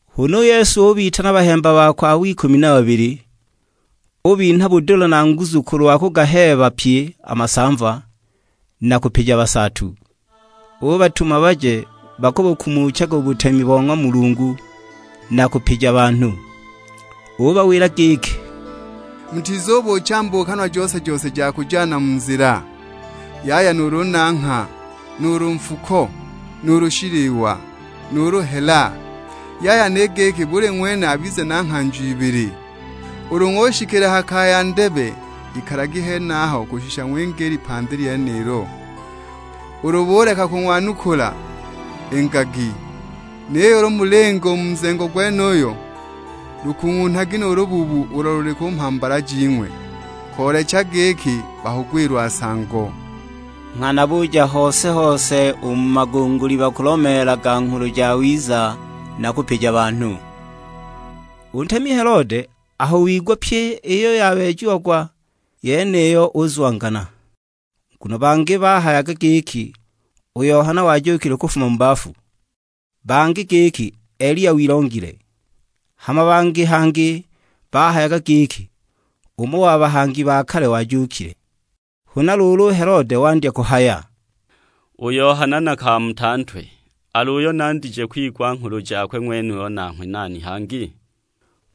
Huna u Yesu ubitana a bahemba bakwe abo ikumi na babili, ubinha budula na nguzu kulwa kugaheeba pye a masamva, na kupija busaatu. Ubatuma baje bakubukumuchaga u butemi bo ng'wa Mulungu, na kupija banhu. Ubawila giki, "Mutizubuucha mbuukanwa jose-jose ja kujana mu nzila; yaya nuulu nangha, nuulu nfuko, nuulu shiliwa, nuulu hela; yaya ni giki buli ng'wene abize na nghanjo ibili. Ulu ng'ushikila ha kaya ndebe, ikalagi henaho kushisha ng'winge i lipandi lyenilo. Ulu buleka kung'wanukula, ingagi; niyo ulu mulinga u mu nzengo gwenuyo, lukung'unhagi nu lubuubu ulo luli ku mhambala jing'we, koolekeja giki bakugwilwa nsango." Nghana buja hose-hose u mu magunguli bakulomeelaga Nghulu Jawiza na kupija banhu. U ntemi Helode aho wigwa pyi iyo yabeejiagwa yeniyo uzwangana, nguno bangi bahayaga giki u Yohana wajuukile kufuma mu bafu. Bangi giki Eliya wilongile, hama bangi hangi bahayaga giki, umo wa bahangi ba kale wajuukile! Huna luulu u Helode wandya kuhaya, "U Yohana nakamuta ntwe, al'uyo nandije kwigwa nghulu jakwe ng'wenuyu nanghwe nani hangi?"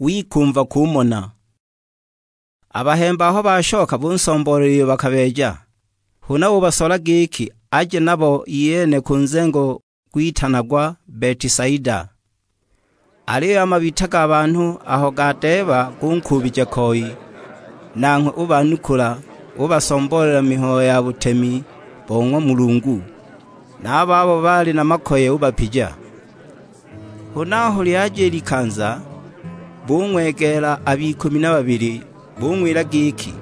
Wikumva kumona. A bahemba aho bashoka bunsomboolela iyo bakabeeja. Huna ubasola giki aje nabo iyene ku nzengo gwitanagwa Betisaida. Aliyo a mabita ga banhu aho gadeeba gunkuubija koi; nanghwe ubanukula, ubasomboolela mihayo ya butemi bo ng'wa Mulungu. Na a babo baali na makoye ubapija. Huna aho lyaja i likanza, bung'wegeela ab'ikumi na babili, bung'wila giki,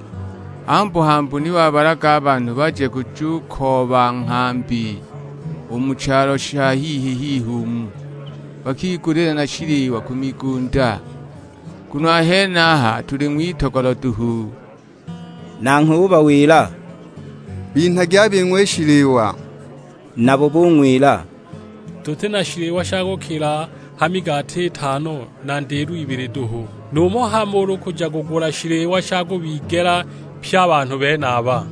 "Hambu-hambu ni wabalaga a banhu baje kujukooba nghambi u mu chalo sha hihi-hihi umu, bakigulile na shiliwa ku migunda; nguno a henaha tuli ng'witogolo duhu!" Nanghwe ubawila, "Binhagi a bing'we i shiliwa." Nabo bung'wila, "Tuti na shiliwa sha kukila ha migati itano na ndilo ibili duhu, numho hamo ulu kuja kugula shiliwa sha kubigela pye a banhu benaba!"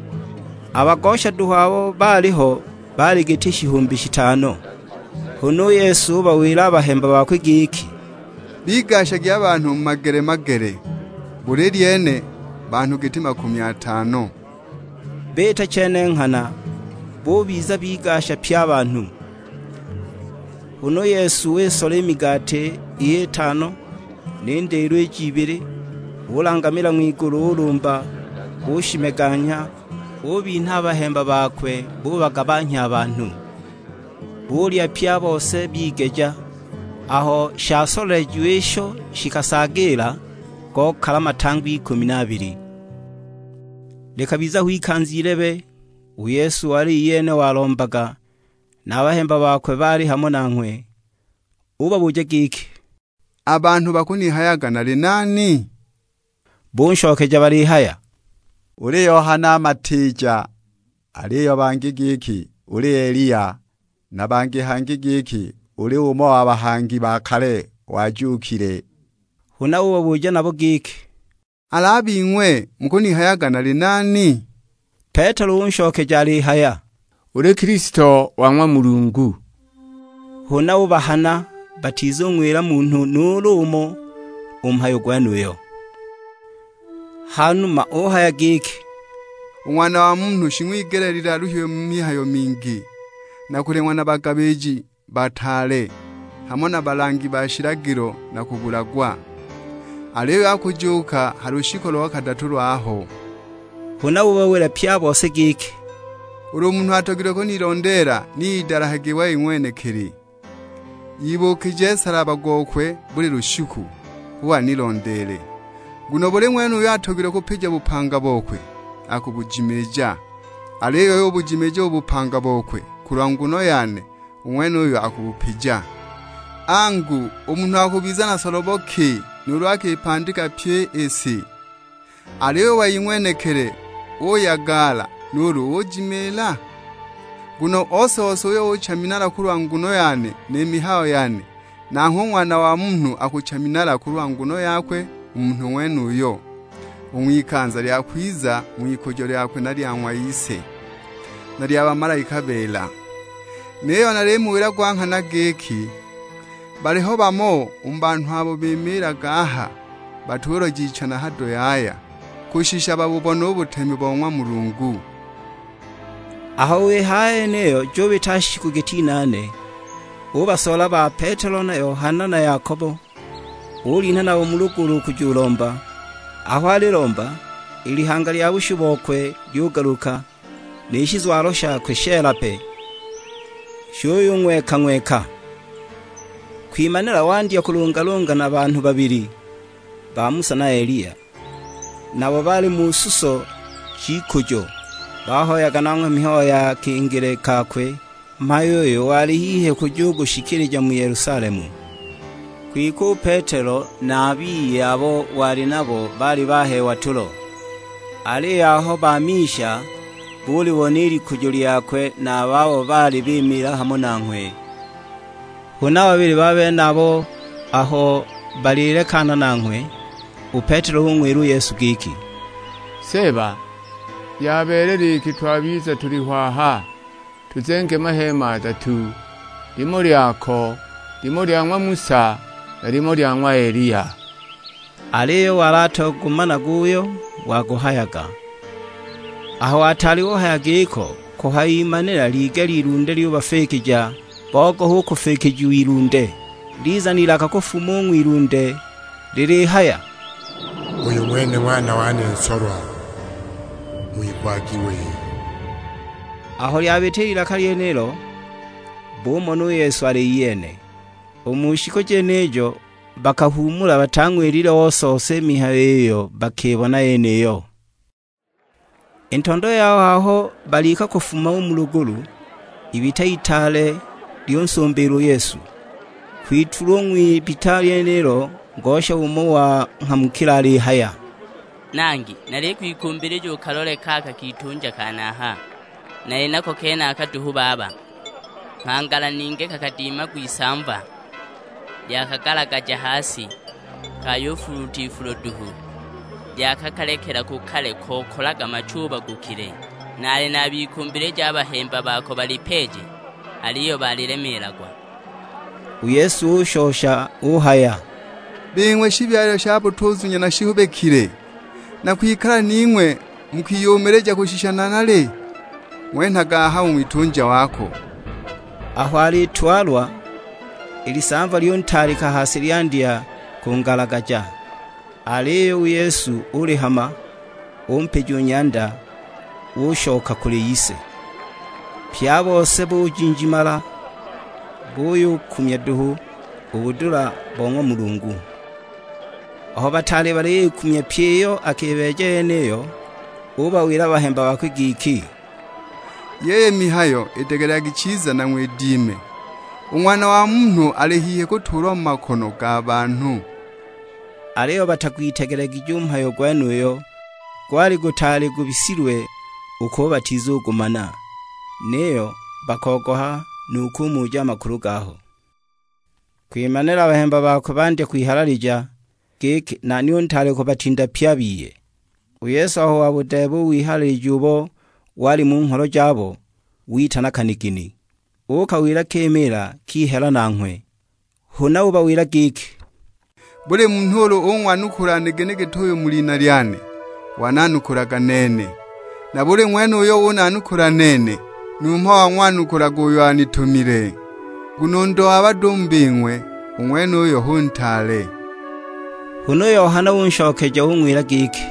A bagosha duhu abo baaliho baali giti shihumbi shitano. Huna u Yesu ubawila a bahemba bakwe giki, "Bigashagi a banhu mu magele-magele, buli lyene banhu giti makumi atano." Biita chene nghana, bubiza bigasha pye a banhu. Huna u Yesu wisola i migati iy'itano ni ndilo ij'ibili, ulangamila ng'wigulu, ulumba; ushimeganya, ubinha a bahemba bubagabanhya a banhu. Bulya pye a bose bigeja, aho shasolelejiwa isho shikasaagiila, gokala matangwa ikumi na abili. Likabiza ho ikanza ilebe, u Yesu wali iyene walombaga, na a bahemba bakwe baali hamo nanghwe; ubabuja giki, "A banhu bakunihayaga nali nani?" Bunshokeja balihaya, "Uli Yohana Matiija, aliyo bangi giki uli Eliya, na bangi hangi giki uli umo wa bahangi ba kale wajuukile." Huna ubabuja nabo giki, "Al'a bing'we mukunihayaga nali nani?" Petelo unshokeja alihaya, "Uli Kilisto wa ng'wa Mulungu!" Huna ubahana batizung'wila munhu nuulu umo u mhayo gwenuyo. Hanuma uhaya giki, "U Ng'wana wa Munhu shing'wigeleelilwe aluhiwe mu mihayo mingi; na kuleng'wa na bagabiji bataale, hamo na balangi ba shilagilo na kubulagwa. Aliyo akujuuka ha lushiku lo kadatu lwaho." Huna ubawila pye a bose giki, "Ulu munhu atogilwe kunilondeela ni idalahage wei ng'wenekili, ibuukije nsalaba gokwe buli lushiku, hu anilondeele. Nguno buli ng'wene uyo atogilwe kupija bupanga bokwe, akubujimiija. Aliyo uyo ubujimiija u bupanga bokwe kulwa nguno yane, u ng'wenuyo akubupija. Angu, u munhu akubiza na solobo ki nuulu akipandika pyi i si, aliyo u wei ng'wenekili uyagala nuulu ujimiila? Nguno ose-ose uyo ucha minala kulwa nguno yane ni mihayo yane, nanghwe u Ng'wana wa Munhu akucha minala kulwa nguno yakwe u munhu ng'wenuyo, u ng'wikanza lya kwiza ng'wikujo lyakwe na lya ng'wa Ise, na lya bamalaika beela. Niyo nalimuwila gwa nghana giki, baliho bamo u mu banhu abo bimiilaga aha batuloja icha na hado yaya, kushisha babubone u butemi bo ng'wa Mulungu." Aho wihaya i yeniyo jubita shiku giti inaane, ubasola ba Petelo na Yohana na Yakobo; ulinha nabo mu lugulu kujulomba. Aho alilomba, i lihanga lya bushu bokwe lyugaluka, ni shizwalo shakwe sheela pe; shuyung'weka-ng'weka. Kwimanila wandya kulungalunga na banhu babili, ba Musa na Eliya; nabo baali mu suso j'ikujo. Bahoyaga nanghwe mihayo ya kingile kakwe; mhayo uyo wali hihi kujugushikilija mu Yelusalemu. Kwike u Petelo na a biye abo wali nabo baali baheewa tulo; aliyo aho bamisha, bulibona i likujo lyakwe na a babo baali bimiila hamo nanghwe. Huna a babili benabo aho balilekana nanghwe, u Petelo ung'wila u Yesu giki, "Seeba, yabeelela iki twabiza tuliho aha; tuzenge maheema adatu, limo lyako, limo lya ng'wa Musa, na limo lya ng'wa Eliya." Aliyo wali atagumanaga uyo waguhayaga. Aho ataali uhaya giko, kuhayimanila ligela ilunde lyubafikija; bogoha u kufikijiwa ilunde. Liza n'ilaka kufuma u ng'wilunde lilihaya, "Uyu ng'wene Ng'wana wane nsolwa, ng'wigwagi wei." Aho lyabita i lilaka lyenilo, bumona u Yesu ali iyene. U mu shiku jenijo bakahuumula, batang'wilile ose-ose i mihayo iyo bakibona yeniyo. I ntondo yaho aho balika kufuma u mu lugulu, ibita itaale lyunsumbiila u Yesu. Kwitulwa u ng'wibita lyenilo ngosha umo wanghamukila alihaya, "Nangi nalikwikumbilija ukalole kaka kitunja kane aha; nali nako kenaka duhu baba. Nghangala ningi kakadimagwa isamva, lyakagalagaja ha si, kayufuluuta ifulo duhu; lyakakalekela ku kale kokalaga machubagukile! Naali nabikumbilija a bahemba bako balipeeje; aliyo balilemeelagwa!" U Yesu ushosha uhaya, "Bing'we shibyalilwe sha butuzunya na shihubikile, nakwikala ning'we mu kwiyumilija kushisha nanali? Ng'wenhage aha u ng'witunja wako!" Aho alitwalwa, i lisamva lyuntaalika ha si lyandya kungalagaja; aliyo u Yesu ulihama, umpija u nyanda, unshosha kuli ise. Pye a bose bujinjimala buyubukumya duhu u budula bo ng'wa Mulungu. Aho bataali baliyikumya pyi iyo akibeeja yeniyo, ubawila a bahemba bakwe giki, "Yiyi mihayo idegelekagi chiza, na ng'widime. U Ng'wana wa Munhu ali hihi kutuulwa mu makono ga banhu." Aliyo batagwitegelegije u mhayo gwenuyo, gwali gutaali gubisilwe u kubo batizugumana; niyo bakogoha nu kumuja a makulu gaho. Kwimanila a bahemba bakwe bandya kwihalalija, giki nani u ntaale kubatinda pye a biye! U Yesu aho wabudeeba u wihalalija ubo wali mu ngholo jabo, witana kanigini. Ukawila kimiila kihela nanghwe. Huna ubawila giki, "Buli munhu ulu ung'wanukula nigini git'uyu mu lina lyane, wananukulaga nene. Na buli ng'wene uyo unanukula nene, numho wang'wanukulaga uyo anitumile. Nguno u ndo wa bado u mu bing'we, u ng'wenuyo hu ntaale." Huna u Yohana unshokeja ung'wila giki,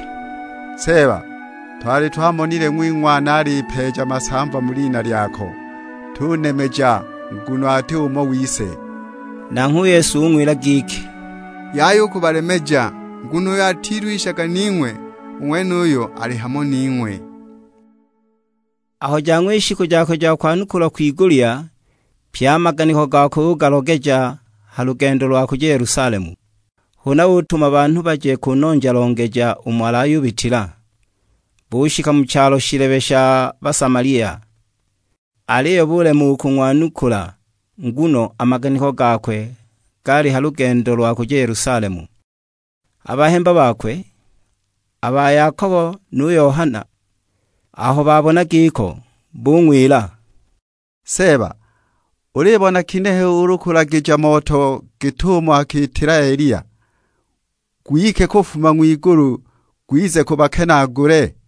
"Seeba, twali twamonile ng'wing'wana alipeeja masamva mu lina lyako; tunemeja nguno ati umo wise." Nanghwe u Yesu ung'wila giki, "Yaya u kubalemeja, nguno uyo atilwishaga ning'we u ng'wenuyo ali hamo ning'we." Aho jang'wa i shiku jakwe ja kwanukulwa kwigulya, pye a maganiko gakwe ugalogeja ha lugendo lwa kuja Yelusalemu. Huna utuma banhu baje kunonja-longeja umo alayubitila. Bushika mu chalo shilebe sha Basamalia, aliyo bulema u kung'wanukula; nguno a maganiko gakwe gaali ha lugendo lwa kuja Yelusalemu. A bahemba bakwe, a ba Yakobo nu Yohana, aho babona giko, bung'wila; "Seeba, ulibona ginehe ulu kulagija moto git'umo akiitila Eliya, gwike kufuma ng'wigulu gwize gubakenaagule?"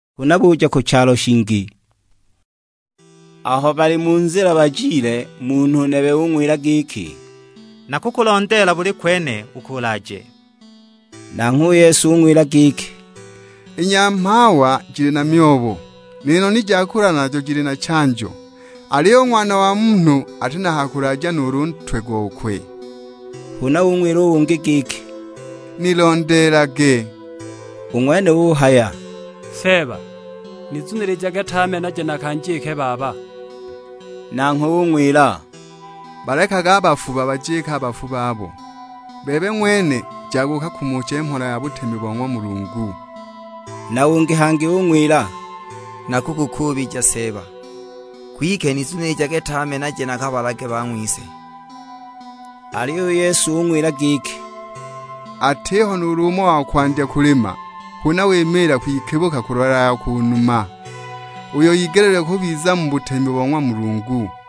Huna buja ku chalo shingi. Aho bali mu nzila bajile, munhu nebe ung'wila giki, "Nakukulondeela buli kwene uko ulaaje." Nanghwe u Yesu ung'wila giki, "I nyamhawa jili na myobo, ni noni ja kulala najo jili na chanjo, aliyo u Ng'wana wa Munhu ati na ha kulaaja nuulu ntwe gokwe!" Huna ung'wila ungi giki, "Nilondeelage." U ng'wene uhaya, "Seeba, nizunilijage tame naje nakanjike baba." Nanghwe ung'wila, "Balekage a bafu babajike a bafu babo; bebe ng'wene jaga ukakumuche mhola ja butemi bo ng'wa Mulungu." Na ungi hangi ung'wila, "Nakukukuubija Seeba, kwike nizunilijage tame naje nakabalage bang'wise." Aliyo u Yesu ung'wila giki, "Atiho nuulu umo wa kwandya kulima huna wimiila kwikibuka kulola ya ku numa, uyo igeleelilwe kubiza mu butemi bo ng'wa Mulungu."